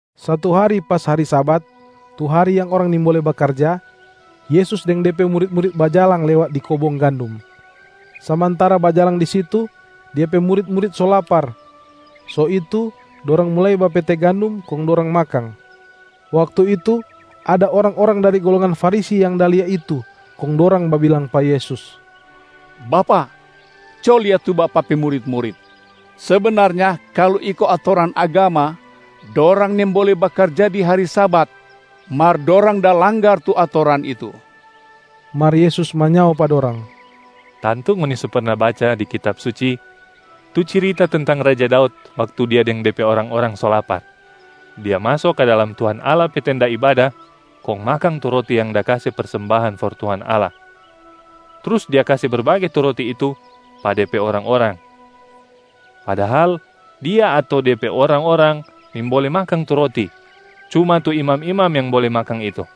Satu hari pas hari Sabat, tu hari yang orang nimbole bakarja, Yesus deng De pe murit-murit bajalang lewat di kobong gandum. Samantara bajalang di situ, Dia pe murit-murit so lapar, so itu dorang mulai bapete gandum kong dorang makang. Waktu itu, ada orang-orang dari golongan Farisi yang da lia itu, kong dorang babilang pa Yesus, “Bapak, co lia tu Bapak pe murit-murit! Sebenarnya kalu iko atoran agama, dorang nimbole bakarja di hari Sabat, mar dorang da langgar tu atoran itu.” Mar Yesus manyao pa dorang, “Tantu ngoni so perna baca di Kitab Suci tu cirita tentang Raja Daud waktu dia deng de pe orang-orang so lapar. Dia maso ka dalam Tuhan Allah pe tenda ibada kong makang tu roti yang da kase persembahan for Tuhan Allah, trus dia kase berbage tu roti itu pa de pe orang-orang, padahal dia ato de pe orang-orang nimbole makang tu roti, cuma tu imam-imam yang bole makang itu.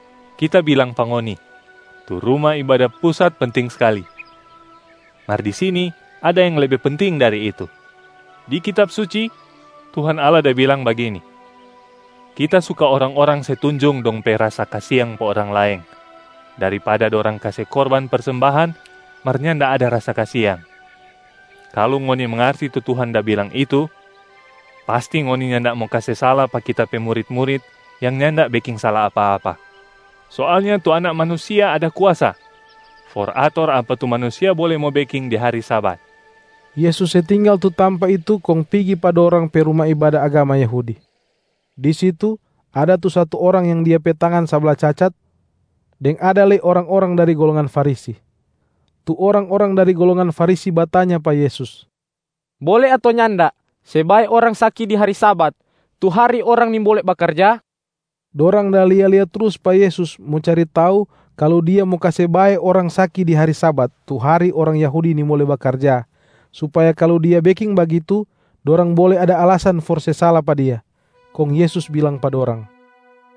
Kita bilang pa ngoni, tu Ruma Ibada Pusat penting skali, mar di sini ada yang lebe penting dari itu. Di Kitab Suci, Tuhan Allah da bilang bagini, ‘Kita suka orang-orang se tunjung dong pe rasa kasiang pa orang laeng, daripada dorang kase korban persembahan mar nyanda ada rasa kasiang.’ Kalu ngoni mangarti tu Tuhan da bilang itu, pasti ngoni nyanda mo kase sala pa Kita pe murit-murit yang nyanda beking sala apa-apa. Soalnya tu Anak Manusia ada kuasa for ator apa tu manusia bole mo beking di hari Sabat.” Yesus se tinggal tu tampa itu kong pigi pa dorang pe ruma ibada agama Yahudi. Di situ ada tu satu orang yang dia pe tangan sabla cacat, deng ada lei orang-orang dari golongan Farisi. Tu orang-orang dari golongan Farisi batanya pa Yesus, “Bole ato nyanda se bae orang saki di hari Sabat, tu hari orang nimbole bakarja?” Dorang da lia-lia trus pa Yesus mo cari tau kalu Dia mo kase bae orang saki di hari Sabat tu hari orang Yahudi nimbole bakarja, supaya kalu Dia beking bagitu, dorang bole ada alasan for se sala pa Dia. Kong Yesus bilang pa dorang,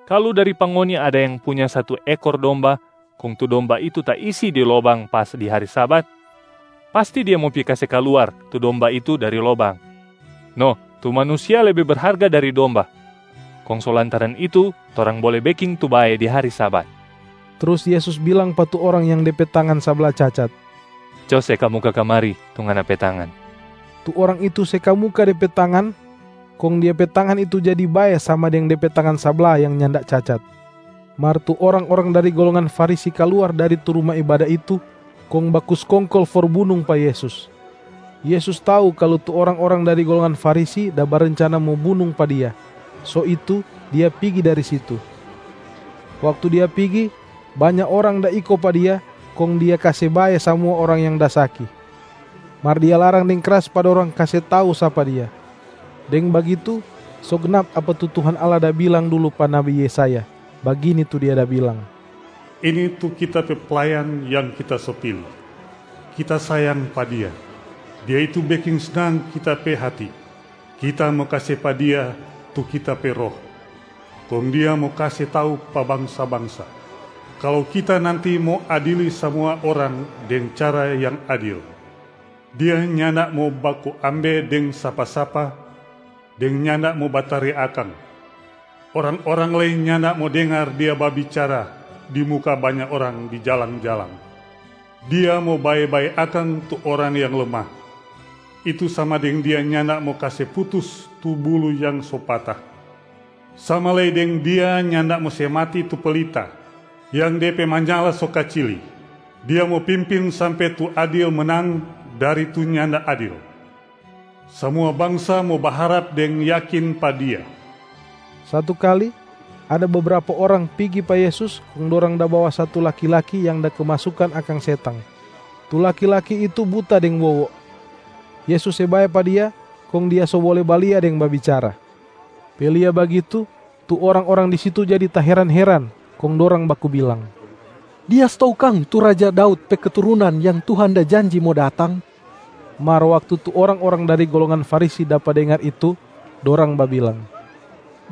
“Kalu dari pa ngoni ada yang punya satu ekor domba kong tu domba itu taisi di lobang pas di hari Sabat, pasti dia mo pi kase kaluar tu domba itu dari lobang. No, tu manusia lebe berharga dari domba, kong so lantaran itu torang bole beking tu bae di hari Sabat.” Trus Yesus bilang pa tu orang yang de pe tangan sabla cacat, “Co se kamuka kamari tu ngana pe tangan!” Tu orang itu se kamuka de pe tangan, kong dia pe tangan itu jadi bae sama deng de pe tangan sabla yang nyanda cacat. Mar tu orang-orang dari golongan Farisi kaluar dari tu ruma ibada itu kong baku skongkol for bunung pa Yesus. Yesus tau kalu tu orang-orang dari golongan Farisi da barencana mo bunung pa Dia, so itu Dia pigi dari situ. Waktu Dia pigi, banya orang da iko pa Dia kong Dia kase bae samua orang yang da saki. Mar Dia larang deng kras pa dorang kase tau sapa Dia. Deng bagitu so gnap apa tu Tuhan Allah da bilang dulu pa nabi Yesaya, bagini tu Dia da bilang, “Ini tu Kita pe Playan yang Kita so pili. Kita sayang pa Dia, Dia itu beking snang Kita pe hati. Kita mo kase pa Dia tu Kita pe Roh, kong Dia mo kase tau pa bangsa-bangsa kalu Kita nanti mo adili samua orang deng cara yang adil. Dia nyanda mo baku ambe deng sapa-sapa deng nyanda mo bataria akang, orang-orang lei nyanda mo dengar Dia babicara di muka banya orang di jalang-jalang. Dia mo bae-bae akang tu orang yang lemah, itu sama deng Dia nyanda mo kase putus tu buluh yang so pata, sama lei deng Dia nyanda mo se mati tu pelita yang de pe manyala so kacili. Dia mo pimpin sampe tu adil menang dari tu nyanda adil. Samua bangsa mo baharap deng yakin pa Dia.” Satu kali, ada bebrapa orang pigi pa Yesus, kong dorang da bawa satu laki-laki yang da kemasukan akang setang. Tu laki-laki itu buta deng wowo. Yesus se bae pa dia, kong dia so bole balia deng babicara. Pe lia bagitu, tu orang-orang di situ jadi taheran-heran, kong dorang baku bilang, “Dia stou kang tu raja Daud pe keturunan yang Tuhan da janji mo datang?” Mar waktu tu orang-orang dari golongan Farisi dapa dengar itu, dorang babilang,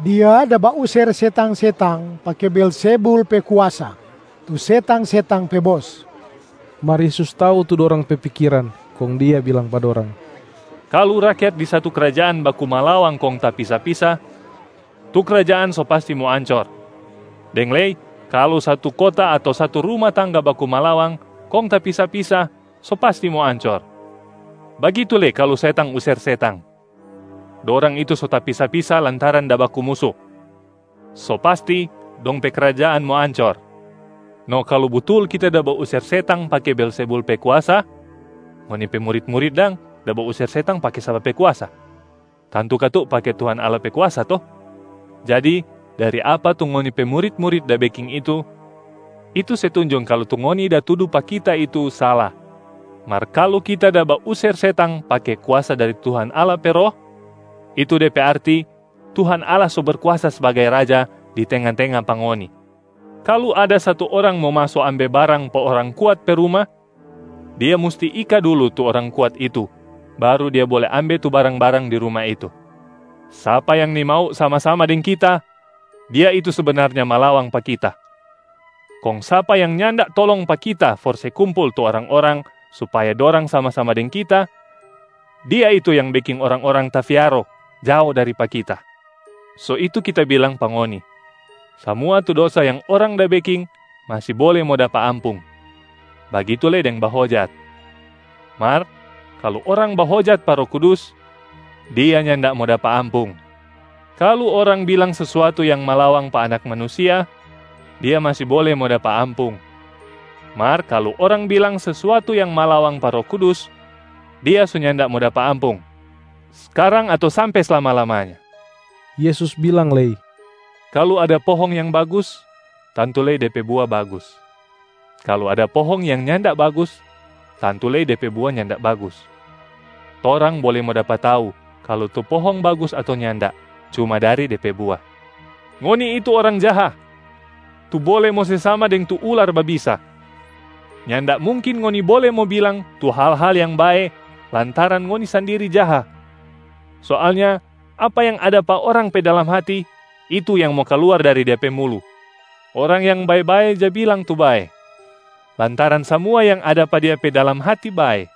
“Dia da bauser setang-setang pake Beelzebul pe kuasa, tu setang-setang pe bos.” Mar Yesus tau tu dorang pe pikiran, kong Dia bilang pa dorang, “Kalu rakyat di satu krajaan baku malawang kong tapisa-pisa, tu krajaan so pasti mo ancor, deng lei kalu satu kota ato satu ruma tangga baku malawang kong tapisa-pisa, so pasti mo ancor. Bagitu lei kalu setang user setang, dorang itu so tapisa-pisa lantaran da baku musu, so pasti dong pe krajaan mo ancor. No kalu butul Kita da bauser setang pake Beelzebul pe kuasa, ngoni pe murit-murit dang da bauser setang pake sapa pe kuasa? Tantu katu pake Tuhan Allah pe kuasa to? Jadi dari apa tu ngoni pe murit-murit da beking itu, itu se tunjung kalu tu ngoni da tudu pa Kita itu sala. Mar kalu Kita da bauser setang pake kuasa dari Tuhan Allah pe Roh, itu de pe arti Tuhan Allah so Berkuasa sbagai Raja di tenga-tenga pa ngoni. Kalu ada satu orang mo maso ambe barang pa orang kuat pe ruma, dia musti ika dulu tu orang kuat itu baru dia bole ambe tu barang-barang di ruma itu.a Sapa yang nimau sama-sama deng Kita, dia itu sebenarnya malawang pa Kita. Kong sapa yang nyanda tolong pa Kita for se kumpul tu orang-orang supaya dorang sama-sama deng Kita, dia itu yang beking orang-orang tafiaro jao dari pa Kita. So itu Kita bilang pa ngoni, samua tu dosa yang orang da beking masi bole mo dapa ampung, bagitu lei deng bahojat. Mar kalu orang bahojat pa Roh Kudus, dia nyanda mo dapa ampung. Kalu orang bilang sesuatu yang malawang pa Anak Manusia, dia masi bole mo dapa ampung. Mar kalu orang bilang sesuatu yang malawang pa Roh Kudus, dia so nyanda mo dapa ampung, skarang ato sampe slama-lamanya.” Yesus bilang lei, “Kalu ada pohong yang bagus, tantu lei de pe bua bagus. Kalu ada pohong yang nyanda bagus, tantu lei de pe bua nyanda bagus. Torang bole mo dapa tau kalu tu pohong bagus ato nyanda, cuma dari de pe bua. Ngoni itu orang jaha, tu bole mo se sama deng tu ular babisa. Nyanda mungkin ngoni bole mo bilang tu hal-hal yang bae lantaran ngoni sandiri jaha. Soalnya apa yang ada pa orang pe dalam hati, itu yang mo kaluar dari dia pe mulu. Orang yang bae-bae ja bilang tu bae, lantaran samua yang ada pa dia pe dalam hati bae.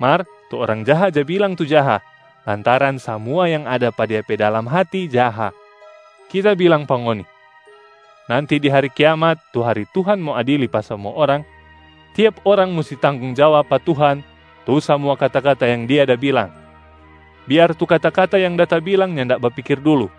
Mar tu orang jaha ja bilang tu jaha, lantaran samua yang ada pa dia pe dalam hati jaha. Kita bilang pa ngoni, nanti di hari kiamat tu hari Tuhan mo adili pa samua orang, tiap orang musti tanggong jawab pa Tuhan tu samua kata-kata yang dia da bilang, biar tu kata-kata yang da tabilang nyanda bapikir dulu.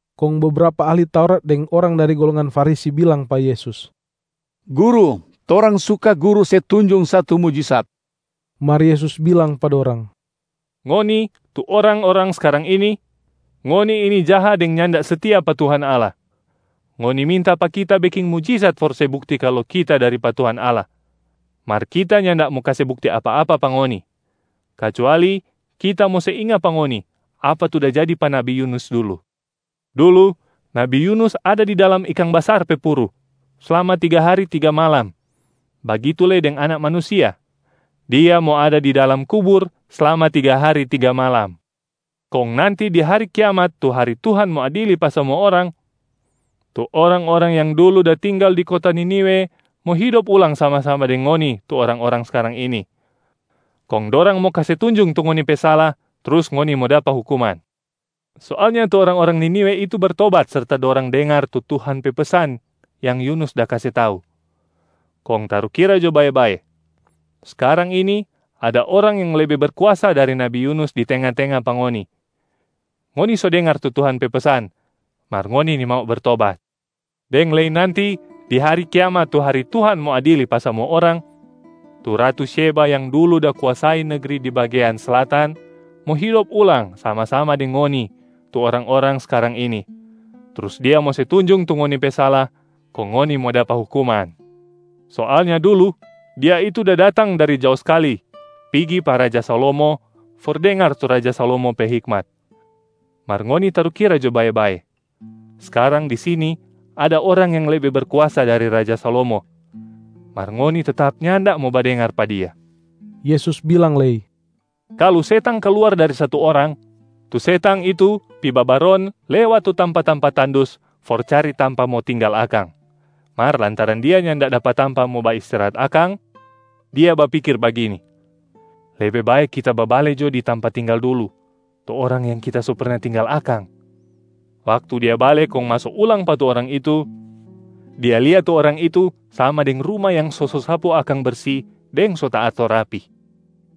Kong bebrapa ahli Taurat deng orang dari golongan Farisi bilang pa Yesus, “Guru, torang suka Guru se tunjung satu mujisat.” Mar Yesus bilang pa dorang, “Ngoni tu orang-orang skarang ini, ngoni ini jaha deng nyanda setia pa Tuhan Allah. Ngoni minta pa Kita beking mujisat for se bukti kalu Kita dari pa Tuhan Allah. Mar Kita nyanda mo kase bukti apa-apa pa ngoni, kacuali Kita mo se inga pa ngoni apa tu da jadi pa nabi Yunus dulu. Dulu nabi Yunus ada di dalam ikang basar pe puru slama tiga hari tiga malam, bagitu lei deng Anak Manusia, Dia mo ada di dalam kubur slama tiga hari tiga malam. Kong nanti di hari kiamat tu hari Tuhan mo adili pa samua orang, tu orang-orang yang dulu da tinggal di kota Niniwe mo hidop ulang sama-sama deng ngoni tu orang-orang skarang ini, kong dorang mo kase tunjung tu ngoni pe sala trus ngoni mo dapa hukuman. Soalnya tu orang-orang Niniwe itu bertobat serta dorang dengar tu Tuhan pe pesan yang Yunus da kase tau. Kong tarukira jo bae-bae, skarang ini ada Orang yang lebe berkuasa dari nabi Yunus di tenga-tenga pa ngoni, ngoni so dengar tu Tuhan pe pesan mar ngoni nimau bertobat. Deng lei nanti di hari kiamat tu hari Tuhan mo adili pa samua orang, tu ratu Syeba yang dulu da kuasai negri di bagean Slatan mo hidop ulang sama-sama deng ngoni tu orang-orang skarang ini, trus dia mo se tunjung tu ngoni pe sala kong ngoni mo dapa hukuman. Soalnya dulu dia itu da datang dari jao skali pigi pa raja Salomo for dengar tu raja Salomo pe hikmat. Mar ngoni tarukira jo bae-bae, skarang di sini ada Orang yang lebe berkuasa dari raja Salomo, mar ngoni tetap nyanda mo badengar pa Dia.” Yesus bilang lei, “Kalu setang kaluar dari satu orang, tu setang itu pi babaron lewat tu tampa-tampa tandus for cari tampa mo tinggal akang. Mar lantaran dia nyanda dapa tampa mo baistirahat akang, dia bapikir bagini, ‘Lebe bae kita babale jo di tampa tinggal dulu, tu orang yang kita so perna tinggal akang.’ Waktu dia bale kong maso ulang pa tu orang itu, dia lia tu orang itu sama deng ruma yang so sosapu akang bersi deng so taator rapi.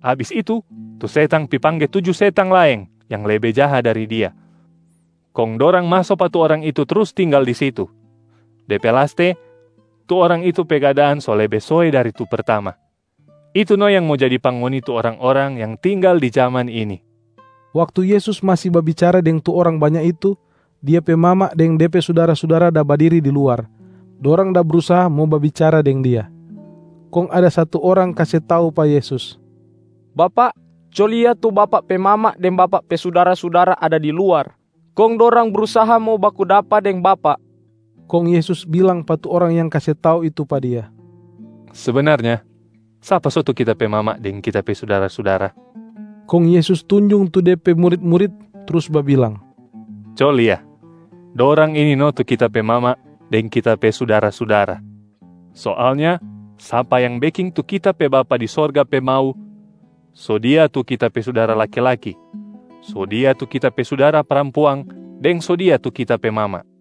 Abis itu, tu setang pi pangge tuju setang laeng yang lebe jaha dari dia, kong dorang maso pa tu orang itu trus tinggal di situ. De pe laste, tu orang itu pe keadaan so lebe soe dari tu pertama. Itu no yang mo jadi pa ngoni tu orang-orang yang tinggal di jaman ini.” Waktu Yesus masi babicara deng tu orang banya itu, Dia pe mama deng De pe sudara-sudara da badiri di luar, dorang da brusaha mo babicara deng Dia. Kong ada satu orang kase tau pa Yesus, “Bapak, co lia tu Bapak pe mama deng Bapak pe sudara-sudara ada di luar, kong dorang brusaha mo baku dapa deng Bapak.” Kong Yesus bilang pa tu orang yang kase tau itu pa Dia, “Sebenarnya sapa so tu Kita pe mama deng Kita pe sudara-sudara?” Kong Yesus tunjung tu De pe murit-murit trus babilang, “Co lia, dorang ini no tu Kita pe mama deng Kita pe sudara-sudara. Soalnya sapa yang beking tu Kita pe Bapa di sorga pe mau, so dia tu Kita pe sudara laki-laki, so dia tu Kita pe sudara parampuang deng so dia tu Kita pe mama.”